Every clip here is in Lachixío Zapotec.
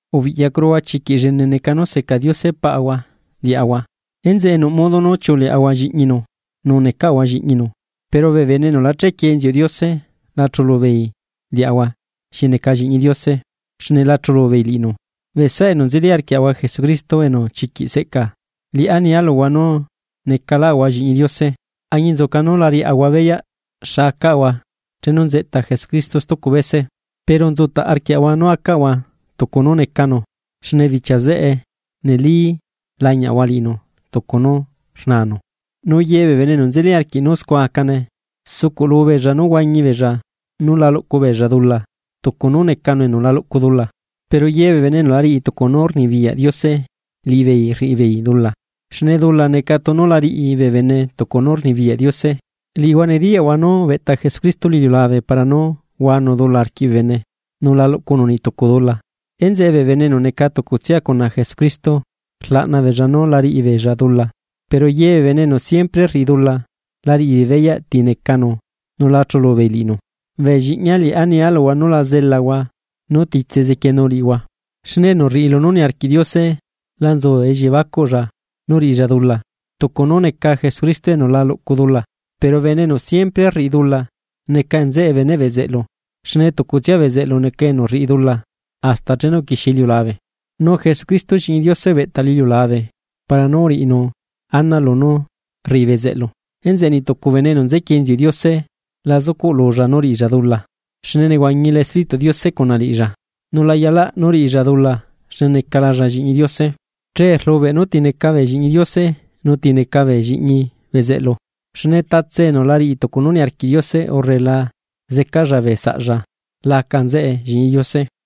Ubiꞌyacuruhua chiquiꞌ llene neca nú seca Diose Paꞌahua liaꞌahua. Enzeꞌe nuꞌ modo nú chiuꞌuleaꞌahua lliꞌñinu, nu necaꞌahua lliꞌñinu. Pero bee bene enu la chequie inziuꞌ Diose la chulu beei liaꞌahua xi neca Lliꞌñi Diose, xne la chulu beei liꞌinu. Bee saꞌa enu nzeli arquiaꞌahua Jesucristo enu chiquiꞌ seꞌca, liꞌá nia luhua nú necalaꞌahua Lliꞌñi Diose. Añinzuca nú la riaꞌahua beyaꞌ xa acaꞌahua chenu nzeꞌta Jesucristo stucu bese, pero nzutaꞌ arquiaꞌahua nú acaꞌahua tucu nú necanu xne bichia zeꞌe neli lañiaꞌahua liꞌinu tucu nú rnaanu. Nu ye bee bene enu nzeli arquiꞌ nú scua acane, sucuꞌlu beella nú huañi beella nú la luꞌcu beella dula, tucu nú necanu enu la luꞌcu dula. Pero ye bee bene enu la riꞌi tucu nú rnibiyaꞌ Diose liꞌibeei rriꞌibeei dula, xne dula neca tunu la riꞌi bee bene tucu nú rnibiyaꞌ Diose. Liꞌihua nediyaꞌhua nú ubeꞌta Jesucristo lu iliulabe para nú huanu dula arquiꞌ bee bene, nu la luꞌcunu niꞌ tucu dula. Enzeꞌe bee bene enu neca tucutsia cuna Jesucristo, rlaꞌna beella nú la riꞌi beella dula. Pero ye bee bene enu siempre rriꞌi dula, la riꞌibeei beyaꞌ ti necanu nu la chulu beei liꞌinu. Bee lliꞌñia liꞌá nia luhua nú la zelahua nú titse zequienu liꞌihua, xne enu rriꞌi lunú niarquiꞌ Diose la nzu elliebacuꞌlla nú riꞌilla dula, tucu nú neca Jesucristo enu la luꞌcu dula. Pero bene enu siempre rriꞌi dula neca nzeꞌe beneꞌ bezeꞌlu, xne tucutsia bezeꞌlu neca enu rriꞌi dula hasta chenu uquixie iliulabe, nu Jesucristo Lliꞌñi Diose ubeꞌta lu iliulabe para nu uriꞌinu ana lunú rriꞌi bezeꞌlu. Enzeꞌe niꞌ tucu bene enu nzequie inziuꞌ Diose la zucuꞌlulla nú riꞌilla dula, xne nehuañila Espírituꞌ Diose cuna liꞌilla, nu la yalaꞌ nú riꞌilla dula xne necalalla Lliꞌñi Diose. Chee rlubeꞌ nú ti neca bee Lliꞌñi Diose nu ti neca bee lliꞌñi bezeꞌlu, xne tatse enu la riꞌi tucu nú niarquiꞌ Diose urre la zecalla bee saꞌlla la aca nzeꞌe Lliꞌñi Diose.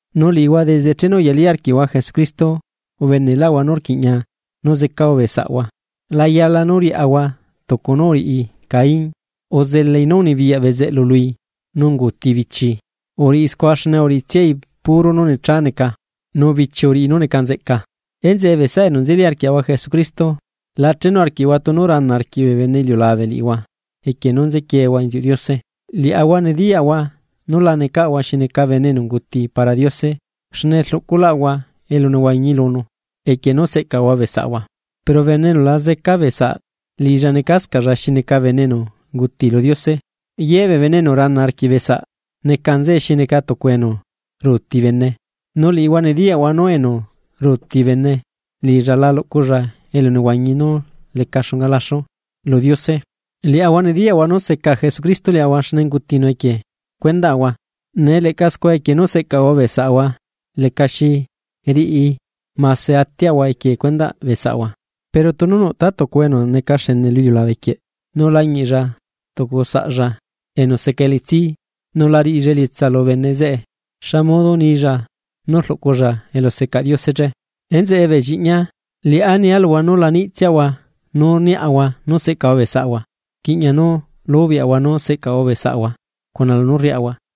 Nu liꞌihua desde chenu uyalí arquiꞌhua Jesucristo, ubeneꞌlaꞌhua nú rquiꞌña nú zecaꞌahua bee saꞌahua. La yala nú riaꞌahua tucu nú uriꞌi Caín, uzelai nú unibiyaꞌ bezeꞌlu lui nú unguuti bichi. Uriꞌi scua xne uriꞌitsiai puro nú necha neca, nu bichii uriꞌi nú neca nzeꞌca. Enzeꞌe bee saꞌa enu nzeli arquiaꞌahua Jesucristo, la chenu arquiꞌhua tunu rana arquiꞌ bee bene iliulabe liꞌihua equie nú nzequieehua inziuꞌ Diose. Liaꞌahua nediyaꞌahua nú la necaꞌahua xi neca bene enu unguti para Diose xne rluculaꞌahua elunehuañi lunu, equie nú seꞌcaꞌahua bee saꞌahua. Pero bene enu la zeca beesaꞌ liꞌilla necascaꞌlla xi neca bene enu unguti lu Diose. Ye bee bene enu rana arquiꞌ bee saꞌ neca nzeꞌe xi neca tucu enu ruuti bene, nu liꞌihua nediyaꞌhua nú enu ruuti bene liꞌilla la luꞌculla elunehuañi nú leca xunga laxu lu Diose. Liaꞌahua nediyaꞌahua nú seca Jesucristo liaꞌahua xne ungutinu equie cuendaꞌahua; nee leꞌca scua equie nú seꞌcaꞌahua bee saꞌahua lecaxi riꞌi mase atiaꞌahua equie cuendaꞌ bee saꞌahua. Pero tunu nuꞌ tatucuhua enu neca xene lu iliulabe quieꞌ nu lañiꞌlla tucu saꞌlla enu seca elitsi, nu la riꞌilla elietsa lu bene zeꞌe, ¿xa modo nilla nú rluꞌculla elusecaꞌ Diose che? Enzeꞌe bee lliꞌñia, liꞌá nia luhua nú la niꞌtsiahua nu rniaꞌahua nú seꞌcaꞌahua bee saꞌahua, rquiꞌña nú lubeaꞌahua nú seꞌcaꞌahua bee saꞌahua cuna lunú rriaꞌahua.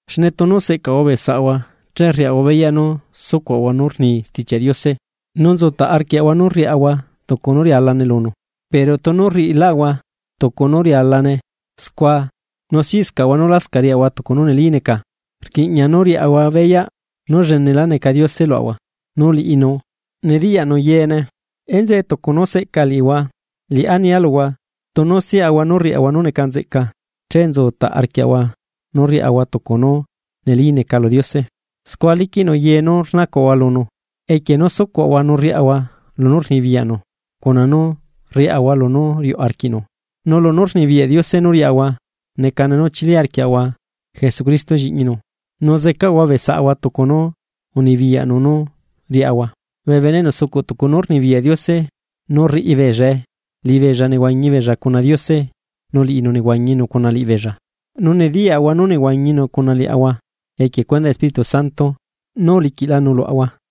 Xne tunu seꞌcaꞌahua bee saꞌahua che riaꞌahua beyaꞌ nú sucuaꞌahua nú rni Stichiaꞌ Diose, nu nzutaꞌ arquiaꞌahua nú rriaꞌahua tucu nú rialane lunu. Pero tunu rriꞌilaꞌahua tucu nu rialane scua nu siꞌscaꞌahua nu lascaꞌ riaꞌahua tucu nú neli neca, rquiꞌña nú riaꞌahua beyaꞌ nú llenela neca Diose luaꞌahua, nu liꞌinu nediyaꞌnu yeene. Enzeꞌe tucu nú seꞌca liꞌihua, liꞌá nia luhua tunu siꞌahua nú rriaꞌahua nu neca nzeꞌca, che nzu taꞌ arquiaꞌahua nú rriaꞌahua tucu nú neli neca lu Diose. Scua liquiꞌnu ye nú rnacuaꞌahua lunu, equie nú sucuaꞌahua nu rriaꞌahua lunú rnibiyaꞌnu cuna nú rriaꞌahua lunú riuꞌ arquiꞌnu. Nu lunú rnibiyaꞌ Diose nú riaꞌahua necane nú chili arquiaꞌahua Jesucristo Lliꞌñi Diose, nu zecaꞌahua bee saꞌahua tucu nú unibiyaꞌnu nú riaꞌahua. Bee bene enu sucuꞌ tucu nú rnibiyaꞌ Diose nu rriꞌi beellae, liꞌibeella nehuañi beella cuna Diose nu liꞌinu nehuañinu cuna liꞌibeella. Nu nediyaꞌahua nú nehuañinu cuna liaꞌahua, equie cuendaꞌ Espíritu Santo nú uliquiꞌlanu luaꞌahua.